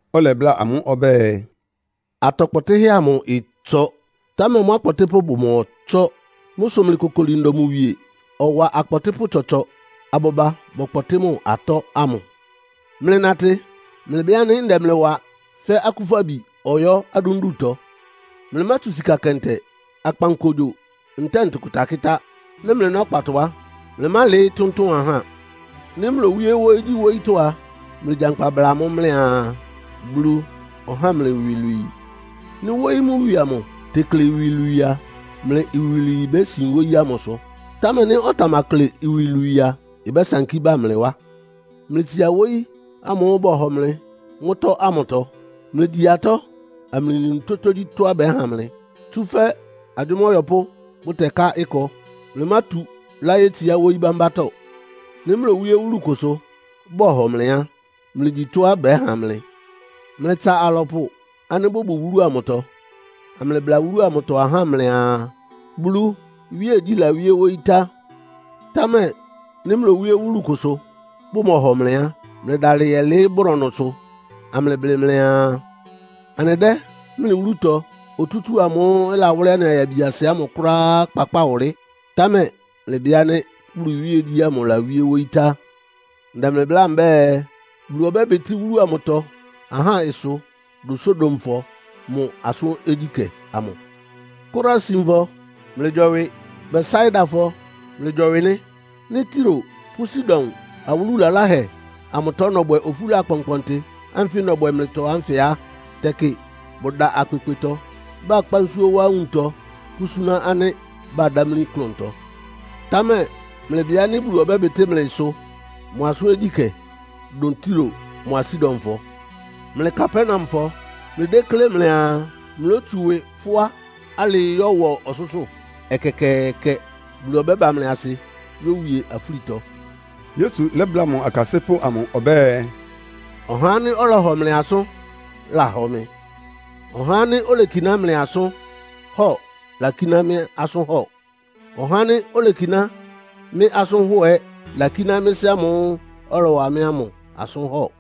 Ɔlɛbláa amʋ́ ɔbɛ́ɛ, “Atɔ kpɔtɩ́hɛ́ amʋ ɩtsɔ, támɛ mʋ́ akpɔtɩ́pʋ́ bʋmɔtsɔ́. Mʋ́ sʋ mlɩkokoli ndɔ mʋ wie, ɔwa akpɔtɩ́pʋ́ tsɔtsɔ abʋba bɔkpɔtɩ́ mʋ atɔ́ ámʋ. Mlɩnatɩ, mlɩbɩ ánɩ́ ndɛ mlɩ wa fɛ́ akúfabi ɔyɔ́ adúndutɔ. Mlɩmátsu sika kɛntɛ, akpankogyo ntɛ́ɛ ntʋkʋta kɩ́tá. Nɩ́ mlɩná ɔkpatɔ á, mlɩmálɩɩ́ tʋ́ntʋn ahá. Nɩ́ mlowíé wóyígyíwóyítɔ́á a, mlɩgyankpa bla amʋ́ mlɩaa, ‘Bulu ɔhá mlɩ iwilwii.’ Nɩ́ wóyí mʋ wie amʋ tekle iwilwii a, mlɩ iwilwii bésin wóyí ámʋsʋ. Támɛ nɩ́ ɔtamakle iwilwii a, ɩbɛ́sankí bá mlɩ wá. Mlɩtsia wóyí ámʋ́ʋ́ bɔhɔ mlɩ mʋ́tɔ́ ámʋtɔ. Mlɩgyi atɔ́, amlɩnu tógyítɔ́á bɛ́ha mlɩ, tsúfɛ́ agyʋ́má ɔyɔpʋ́ bʋtɛká ɩkɔ. Mlɩmátu láyétsiá wóyí bámbátɔ́. Nɩ́ mlowíe wúlu kʋsʋ, bɔhɔ mlɩ á, mlɩgyi tɔ́á bɛ́ha mlɩ. Mlɩtsa alɔpʋ ánɩ́ bʋbʋ wúlu amʋtɔ, amlɩbla wúlu amʋtɔ ahá mlɩaa, ‘Bulu iwíegyí lawíé wóyí tá.’ Támɛ nɩ́ mlowíé wúlu kʋsʋ, bʋmɔhɔ mlɩ á, mlɩdalɩ yɛlɩɩ́ brɔnʋsʋ, amlɩblɩ mlɩaa, ‘Anɩdɛ́ mlɩ wúlutɔ otútúu amʋ́ʋ́ ɩlawʋ́lɩ́ anɩ ayabiasɩ amʋ kʋ́ráá kpakpáa wʋlɩ́. Támɛ mlɩbɩ ánɩ́ Bulu iwíegyí ámʋ lawíé wóyí tá.’ Ndɛ mlɩ bláa mbɛ́ɛ, Bulu ɔbɛ́bɩtɩ́ wúlu amʋtɔ ahá ɩsʋ dʋn Sodomfɔ mʋ asʋ́n ogyíkɛ́ amʋ. “Korasinfɔ, mlɩgyɔwɩ. Betsaidafɔ, mlɩgyɔwɩ nɩ́. Nɩ́ Tiro pʋ́ Sidon awúlu laláhɛ amʋtɔ nɔbwɛ ofúla akpɔnkpɔntɩ ánfɩ nɔbwɛ mlɩtɔ ánfɩ á, tɛkɩ bʋda akpekpetɔ, bakpá nsúó wá nwuntɔ pʋ́súná ánɩ́ badámlí klʋntɔ. Támɛ mlɩbɩ ánɩ́ Bulu ɔbɛ́bɩtɩ́ mlɩ ɩsʋ mʋ asʋ́n ogyíkɛ́ dʋn Tiro mʋ́a Sidonfɔ. Mlɩ Kapernaumfɔ, mlɩdéklé mlɩaa mlótsu ɩwɩ fʋ́á alɩɩ yɔ́wɔ ɔsʋ́sʋ́? Ɛkɛkɛɛkɛ! Bulu ɔbɛ́ba mlɩ asɩ yówie afúlitɔ.” Yesu lɛ́bláa mʋ akasɩ́pʋ́ amʋ ɔbɛ́ɛ, “Ɔhá ánɩ́ ɔhɔ mlɩ asʋ́n lahɔ mɩ. Ɔhá ánɩ́ olekiná mlɩ asʋ́n hɔ lakíná mɩ́ asʋ́n hɔ. Ɔhá ánɩ́ olekiná mɩ́ asʋ́n hɔ ɛ́ lakíná mɩ́ Sɩ́ ámʋ́ʋ́ ɔlɔwa mɩ́ ámʋ asʋ́n hɔ.”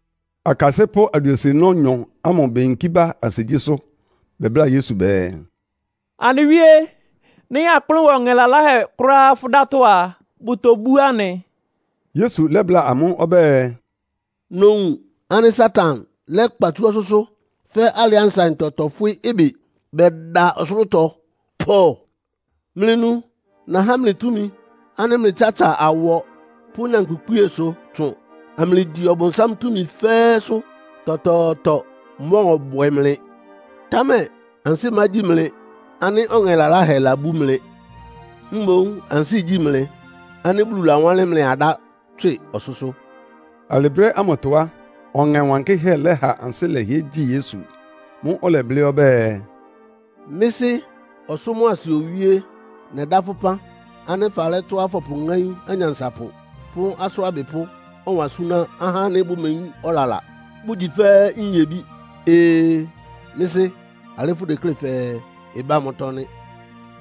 Akasɩ́pʋ́ aduesienɔ́-nyɔ ámʋ beyinkí ba ansigyísʋ́. Bɛbláa Yesu bɛɛ, “Anɩ Wíé, nɩ́ akplʋ́n wa ɔŋɛ laláhɛ kʋ́ráá fʋ́ dátɔ́ a, bʋtobú anɩ.” Yesu lɛ́bláa amʋ́ ɔbɛ́ɛ, “Nowun ánɩ́ Satan lɛ́kpa tsú ɔsʋ́sʋ́ fɛ́ alɩá nsaɩntɔ tɔfwɩ́ ɩbɩ bɛda ɔsʋlʋ́tɔ pɔ. Mlɩnu! Nahá mlɩ túmi ánɩ́ mlɩtsatsa awɔ pʋ́ nyankpʋkpíesʋ tsʋn, amlɩgyi Ɔbʋnsám túmi fɛ́ɛ́sʋ́. Tɔtɔɔtɔ mɔ́ɔbwɛ mlɩ. Támɛ ansɩ́ mágyi mlɩ ánɩ́ ɔŋɛ laláhɛ labú mlɩ. Mboún ansɩ́ igyi mlɩ ánɩ́ Bulu lawánlɩ́n mlɩ adá tswɩ ɔsʋ́sʋ́.” Alɩ brɛ́ ámʋtɔ á, Ɔŋɛ Wankɩ́hɛ́ lɛ́ha ansɩ́ lɛhɩɛ gyi Yesu. Mʋ́ʋ́ ɔlɛblɩ́ ɔbɛ́ɛ, “Mɩ́ Sɩ́, ɔsʋ́ mʋa asɩ Owíé! Nɛdá fʋ́ ɩpán ánɩ́ falɛ́ tɔ́á fɔpʋŋáín anyansapʋ pʋ́ asʋ́n abɩpʋ́ ɔwan súná ahá ánɩ́ bʋmeyín ɔlala, bʋgyi fɛ́ nyebí. Ee, Mɩ́ Sɩ́! Alɩ́ fʋdeklé fɛɛ ɩbá mʋ́tɔ́ nɩ́.”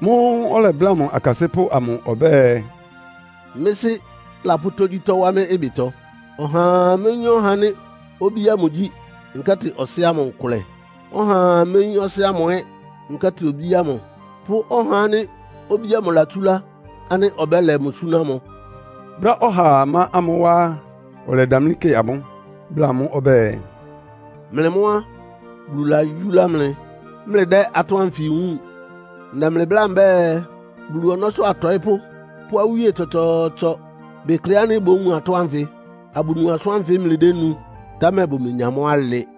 Mʋ́ʋ́ ɔlɛbláa mʋ akasɩ́pʋ́ amʋ ɔbɛ́ɛ, “Mɩ́ Sɩ́ lapʋ́ tógyítɔ́ wá mɩ́ ɩbɩtɔ. Ɔhaa méyín ɔhá ánɩ́ Obí ámʋ gyí, nkɛ́tɩ Ɔsɩ́ ámʋ nkʋlɛ. Ɔhaa méyín Ɔsɩ́ ámʋ ɛ́, nkɛ́tɩ Obí ámʋ, pʋ́ ɔhá ánɩ́ Obí ámʋ latsúlá ánɩ́ ɔbɛ́lɛ mʋ súná mʋ.” Brɛ́á ɔhaa má amʋ́ wá á, ɔlɛdamlí kɩ amʋ́, bláa amʋ́ ɔbɛ́ɛ, “Mlɩ mʋ́ á, Bulu layúlá mlɩ, mlɩdɛ́ atɔ́ ánfɩ wúun. Ndɛ mlɩ bláa mbɛ́ɛ, Bulu ɔnɔ́sʋ́ atɔɩ́pʋ́ pʋ́ awíe tsɔtsɔɔtsɔ bekle ánɩ́ bówun atɔ́ ánfɩ, abʋnu asʋ́n ánfɩ mlɩdénu, támɛ bʋmenya mʋ́ alɩ.”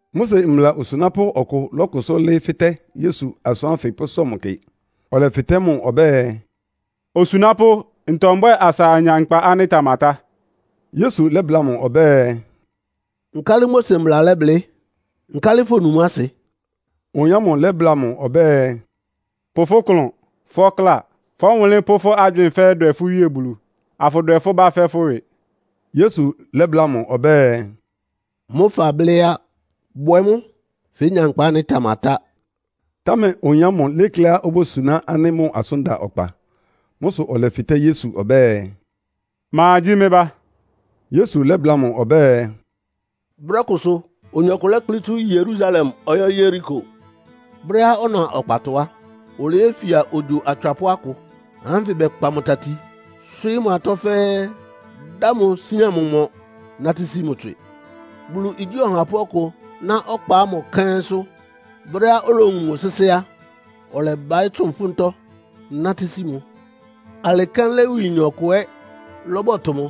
Mose mbla osunápʋ́ ɔkʋ lɔ́kʋsʋ́ lɩ́ɩ́ fɩ́tɛ́ Yesu asʋ́n ánfɩ pʋ́sɔ mʋ kɩ. Ɔlɛfɩtɛ́ mʋ ɔbɛ́ɛ, “Osunápʋ́, ntɔ mbwɛ́ɛ asa anya nkpa ánɩ́ ɩtamatá?” Yesu lɛ́bláa mʋ ɔbɛ́ɛ, “Nkálɩ Mose Mbla lɛ́blɩ́? Nkálɩ fonu mʋ́ asɩ?” Oyin ámʋ lɛ́bláa mʋ ɔbɛ́ɛ, “Pʋ fʋ́ klʋn, fʋ́ ɔkláa, fʋ́ ɔwʋnlɩ́n pʋ́ fʋ́ agywɩɩn fɛ́ɛ́ dwɛ fʋ́ Wíe Bulu, afʋdwɛ fʋ́ bá fɛ́ fʋ́ ɩwɩ.” Yesu lɛ́bláa mʋ ɔbɛ́ɛ, “Mʋ́ fablɩ́ á. Bwɛ mʋ́, fénya nkpa ánɩ́ ɩtamatá.” Támɛ oyin ámʋ lékléá obósuná ánɩ́ mʋ́ asʋ́n da ɔkpa. Mʋ́ sʋ ɔlɛfɩtɛ́ Yesu ɔbɛ́ɛ, “Ma gyí mɩ́ bá?” Yesu lɛ́bláa mʋ ɔbɛ́ɛ, “Brɛ́ kʋsʋ oyin ɔkʋ lɛ́kplɩ́ tsú Yerusalem ɔyɔ́ Yeriko. Brɛ́á ɔna ɔkpatɔ á, oleyéfia ogyo atswapʋ́ akʋ. Ahá ánfɩ bɛkpa mʋ tati, swɩ́ɩ́ mʋ atɔ́ fɛ́ɛ́, dá mʋ sian mʋ mɔ, nátɩ́ sí mʋ tswɩ. Bulu igyí ɔhapʋ́ ɔkʋ ná ɔkpa ámʋ kɛ́nsʋ́. Brɛ́á olowun mʋ sɩ́sɩ́ á, ɔlɛbaɩ́ tsʋn ɩfʋ́ntɔ́ nátɩ́ sí mʋ. Alɩ kɛ́n Lewiyin ɔkʋ ɛ́ lɔ́bɔtʋ mʋ,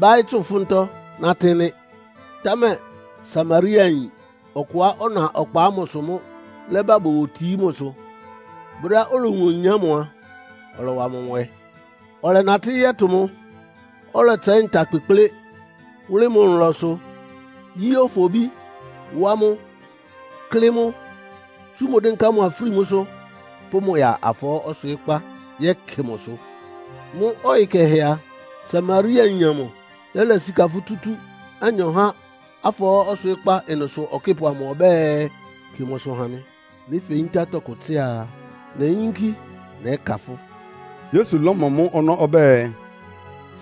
báɩ́ tsʋn ɩfʋ́ntɔ́ nátɩ́ nɩ́. Támɛ Samariayin ɔkʋá ɔná ɔkpa ámʋsʋ mʋ́ lɛ́ba bowotií mʋsʋ. Brɛ́á olowun oyin ámʋ a, ɔlɔwa mʋ nwɛ. Ɔlɛnatɩ́ yɔ́tʋ mʋ. Ɔlɛtsɛɩ́ nta kpekplé wʋ́lɩ́ mʋ nlɔsʋ, yí ofobí wá mʋ́, klɩ́ mʋ́, tsú mʋ dɩ́nká mʋ afrímúsʋ́, pʋ́ mʋ ya afɔɔ́ ɔswɩɩ́kpá yɛ́kɩ mʋsʋ. Mʋ́ ɔyɩ kɛhɛ a, Samariayin amʋ lɛ́lɛ sika futútú anyɔ há afɔɔ́ ɔswɩɩ́kpá ɩnʋsʋ ɔkɩ́pʋ ɔbɛ́ɛ, ‘Kɩ mʋsʋ ha mɩ. Nɩ́ feyintá tɔkʋ tsɩ́a a, neyínkí nɛ́ka fʋ́.’” Yesu lɔ́mɔ mʋ́ ɔnɔ́ ɔbɛ́ɛ,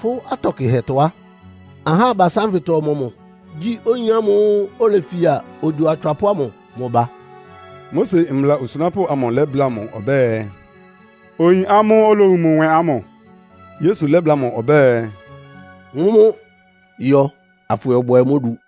“Fʋ́ atɔ kɩhɛtɔ á, ahá abasá ánfɩtɔ ɔmɔmʋ gyí oyin ámʋ́ʋ́ olefia ogyo atswapʋ́ ámʋ mʋ ba?” Mose mbla osunápʋ́ amʋ lɛ́bláa mʋ ɔbɛ́ɛ, “Oyin ámʋ́ʋ́ olowun mʋ nwɛ ámʋ.” Yesu lɛ́bláa mʋ ɔbɛ́ɛ, “Mʋ́mʋ́ yɔ afʋyɔbwɛ mʋ́ odu.”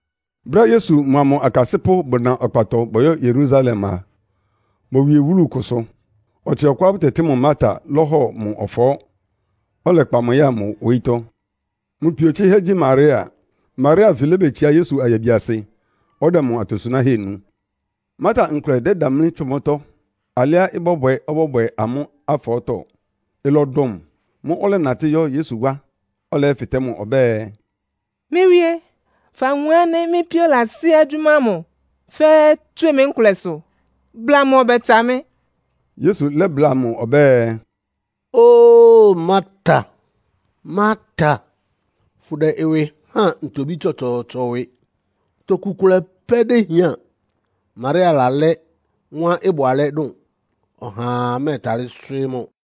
Brɛ́á Yesu mʋa mʋ akasɩ́pʋ́ bʋna ɔkpatɔ bɔyɔ́ Yerusalem a, bowie wúlu kʋsʋ. Ɔtsɩ ɔkʋá bʋtɛtɩ́ mʋ Marta lɔ́hɔ mʋ ɔfɔɔ́, ɔlɛkpa mʋ ya mʋ wóyítɔ́. Mʋ pio tsɩhɛ́ gyí Maria. Maria anfɩ lébetsiá Yesu ayabiasɩ, ɔdɛ mʋ atosunáhɛ́ nu. Marta nkʋlɛ dɛ́damlí tsʋn mʋ́tɔ́, alɩá ɩbɔ́bwɛ ɔbɔ́bwɛ amʋ́ afɔɔ́tɔ. Ɩlɔdʋn mʋ. Mʋ́ʋ́ ɔlɛnatɩ́ yɔ́ Yesu wá, yɛ́fɩtɛ́ mʋ ɔbɛ́ɛ, “Mɩ́ Wíé, fawun ánɩ́ mɩ́ píó lasí agyʋ́má ámʋ fɛ́ɛ́ tswɩ mɩ nkʋlɛsʋ? Bla mʋ ɔbɛtsa mɩ́.” Yesu lɛ́bláa mʋ ɔbɛ́ɛ, “Óo Marta, Marta! Fʋdɛ fʋ́ ɩwɩ háan ntobí tsɔtsɔɔtsɔ ɩwɩ. Toku kʋlɛ pɛ́ déhián, Maria lalɛ́ mʋ́á ɩbʋ alɛ́ dʋn. Ɔhaa mɛ́ɛtalɩ́ swɩ́ɩ́ mʋ.”